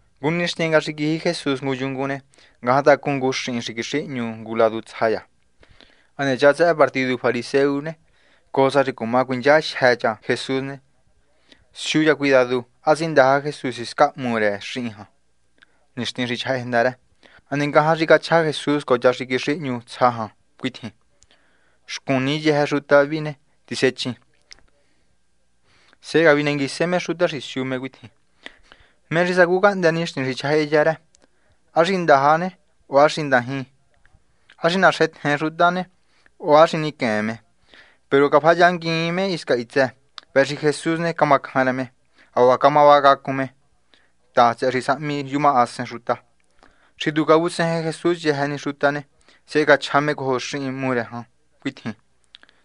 Ngu nixtin nga xi quiji Jesús ngu yungun ne, ngajan tacun ngu xihin xi quixihñu ngu ladu tsja cha. Hane cha tsëhë partidu fariseo ne, cojo sa xi cuma cuinchajyë cha Jesús ne, siu cha cuidadu, ¿há tsindaja Jesús hiscan hmu rë xihin jan nixtin xi chjahájenda rë? Hane ngajan xi cachja Jesús cojo cha xi quixihñu tsja jan cuitjin: ―Xcun ni yëjë xuta vi ne, tisechin. Sehe cavinenguise me xuta xi siu me cuitjin: ―¿Mé xi sacu cahndë́ nixtin xi chjahájenda rë? ¿Há xi ndaja ne, o há xi ndajin, há xi naxentjen xuta o há xi niquen me? Peru cafayinnguiin me hisca hitsë. Vëhë xi Jesús ne, cama cjan rë me. Hacuaha cama vacacun me ta, tsëhë xi sahmi yumahasen xuta. Xi tu cavutsejen Jesús yëjë ni xuta ne, sehe cachja me cojo xihin hmu rë jan cuitjin: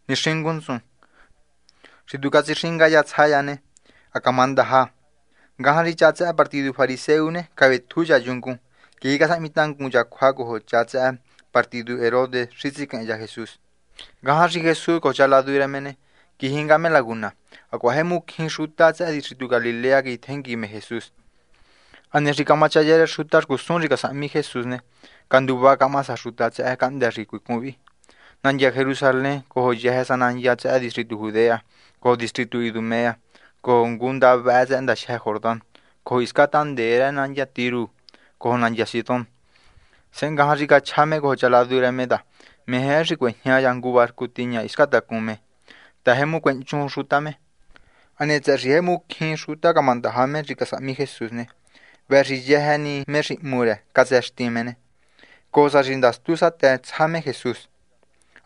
―Nixingun ntsun. Xi tu catsixinga cha tsja cha ne, ha camandaja. Ngajan xi cha tsëhë partidu fariseo ne, cavetju cha yungun. Quiji casahmitangun cha cjua cojo cha tsëhë partidu Herodes xi tsiquehen cha Jesús. Ngajan xi Jesús cojo cha ladu rë me ne, quiji nga me laguna. Hacuaha jemu cjín xuta tsëhë distritu Galilea quijitjengui me Jesús. Hane xi camachaya rë xuta xcusun xi casahmi Jesús ne, canduva camaha sa xuta tsëhë cahndë́ xi cuicun vi: nandya Jerusalén cojo yëjë sa nandya tsëhë distritu Judea, cojo distritu Idumea, cojo ngunda vëhë tsëhë ndajyë Jordán cojo hisca tahndee rë nandya Tiro cojo nandya Sidón. Sehe ngajan xi cachja me cojo cha ladu rë me ta meje rë xi cuejña cha ngu barcu tiña hiscan tacun me, ta jemu cuehnchun xuta me. Hane tsëhë xi jemu cjín xuta camandaja me xi casahmi Jesús ne, vëhë xi yëjë ni me xi hmu rë catsëxti me ne, cojo sa xi ndastu satë tsja me Jesús.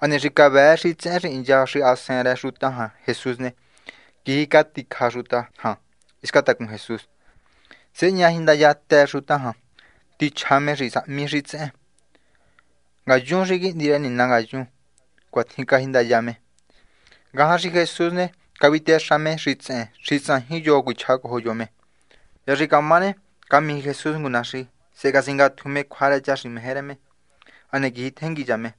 Hane xi cavëë xitsehen xi hincha xahasen rë xuta jan Jesús ne, quiji caticja xuta jan hisca tacun Jesús. Sehe ña jindayatë xuta jan, ta xitsehen casahmi xi cachja me cuitjin: ―Ngayun xi Quihndi rë Nina ngayun. ―Cuatjin cajindaya me. Ngajan xi Jesús ne, cavitexa me xitsehen xi tsajin yo cuichja cojo yo me. Hya xi camá ne, camiji Jesús ngu naxi. Sehe catsingatju me cjua rë cha xi meje rë me. Hane quijitjengui cha me.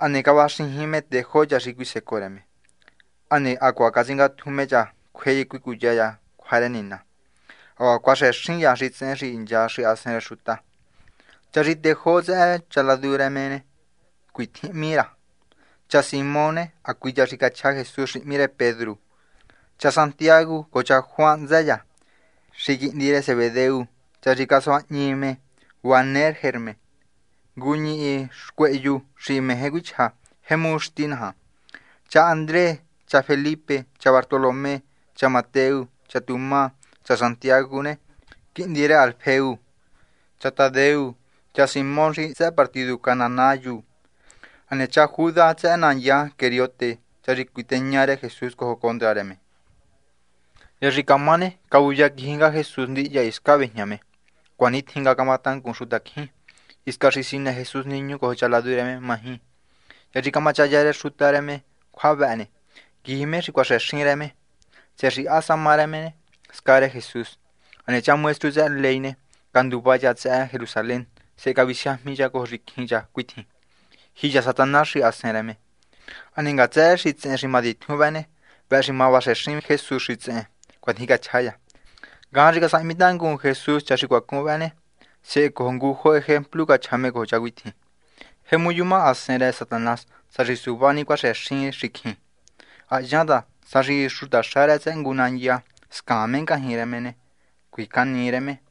Hane cavaxijin me tejó cha xi cuisecoo rë me, hane hacuaha tsingatju me cha cjue cuicuya cha xuta cjua rë Nina, hacuaha cuaxëxin cha xitsehen xi hincha xahasen rë xuta. Cha xi tejó tsëhë cha ladu rë me cuitjin hmí ra: cha Simón ne, hacui cha xi cachja Jesús xi hmí rë Pedru, cha Jacobo cojo cha Juan hntsë cha ne, xi quihndi rë Zebedeo, cha xi casuañihi me Boanergerne, ngu ñihi xcuehyu xi meje cuichja Jemu Xti Naja, cha Andrés, cha Felipe, cha Bartolomé, cha Mateo, cha Tomás, cha Jacobo, quihndi rë Alfeo, cha Tadeo, cha Simón xi tsëhë partidu cananayu, hane cha Judas tsëhë nandya Queriote, cha xi cuiteña rë Jesús cojo condra rë me. Hya xi camá ne, cavuya quiji nga Jesús ndihya hiscan véjña me. Hacuanitjin nga camatangun xuta cjín. Hisca xi sinë Jesús niñu cojo cha ladu rë me maji. Hya xi camachaya rë xuta rë me cjua vëhë ne, quiji me xi cuaxëxin rë me, tsëhë xi há sa má rë me, sca rë Jesús. Hane cha maestru tsëhë ley ne, canduva cha tsëhë Jerusalén. Sehe cavisiajmi cha cojo xicjin cha cuitjin: ―Jiya Satanás xahasen rë me. Hane ngatsë rë xitsehen xi matitjun vë ne, vëhë xi ma vaxëxin Jesús xitsehen. ―Cuatjin cachja cha. Ngajan xi casahmi tangun Jesús cha xi cuacun vëhë ne, sehe cojo ngujo ejemplu cachja me cojo cha cuitjin: ―Jemu yuma hasen rë Satanás sá xi suva ni cuaxëxin xicjin. Ha hyan ta sá xi xutaxa rë tsëhë ngu nandya scaan me ngajñi rë me ne, cjuicanii rë me.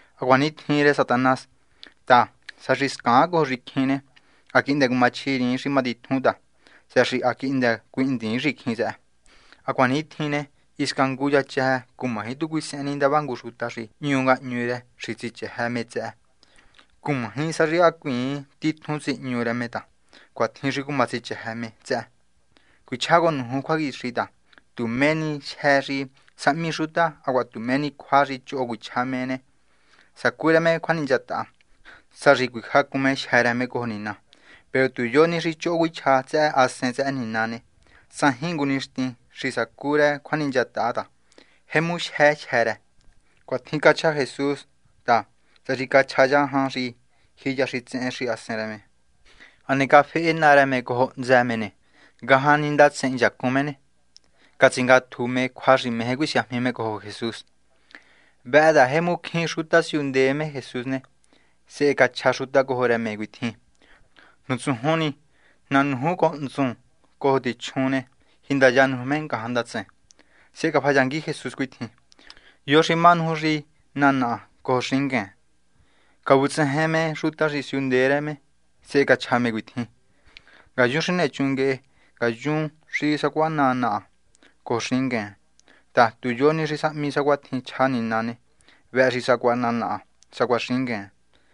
Ha cuanitjin rë Satanás ta sá xi scaan cojo xicjin ne, ha quihndë cumachjiriin xi matitjun ta, tsëhë xi ha quihndë cuihndiin xicjin tsëhë. ’Hacuanitjin ne, hisca ngu cha chëjë cumaji tu cuisehen ni cha ndava ngu xuta xi hñu ngahñu rë me xi tsichëjë cha tsëhë me. Cumaji sa xi hacuiin titjun tsihñu cha me ta cuatjin xi cuma tsichëjë cha tsëhë me. ’Cuichjá cojo nuju cjuaquixi ta tu mé ni jyë́ xi sahmi xuta hacuaha tu mé ni cjua xi choho cuichja me ne, sacu rë me cjuaninchataha, sá xi cuijacun me jyë́ rë me cojo Nina. Peru tu yo ni xi choho cuichja tsëhë Hasen rë Nina ne, tsajin ngu nixtin xi sacu rë cjuaninchataha ta jemu jyë jyë́ rë. Cuatjin cachja Jesús ta tsëhë xi cachja cha jan xi jiya xitsehen xahasen rë me. Hane cafehe naa rë me cojo hntsë me ne, ngajan ni ndatsen hinchacun me ne, catsingatju me cjua xi meje cuisiajmi me cojo Jesús. Vëhë ta jemu cjín xuta siundee me Jesús ne, sehe cachja xuta cojo rë me cuitjin: ―Nutsujun ni. Ná nuju cojo tsuhun cojo tichjun ne, jindaya nuju me ngajan candatsen. Sehe cafayangui Jesús cuitjin: ―¿Yo xi má nuju xi ná naha cojo xingueen? Cavutsejen me xuta xi siundee rë me, sehe cachja me cuitjin: ―Ngayun xi nechun nguehe, ngayun xi sacuaha ná naha cojo xingueen ta, tu yo ni xi sahmi sacuatjin chja Nina ne, vëhë xi sacuaha ná naha sacuaha xingueen.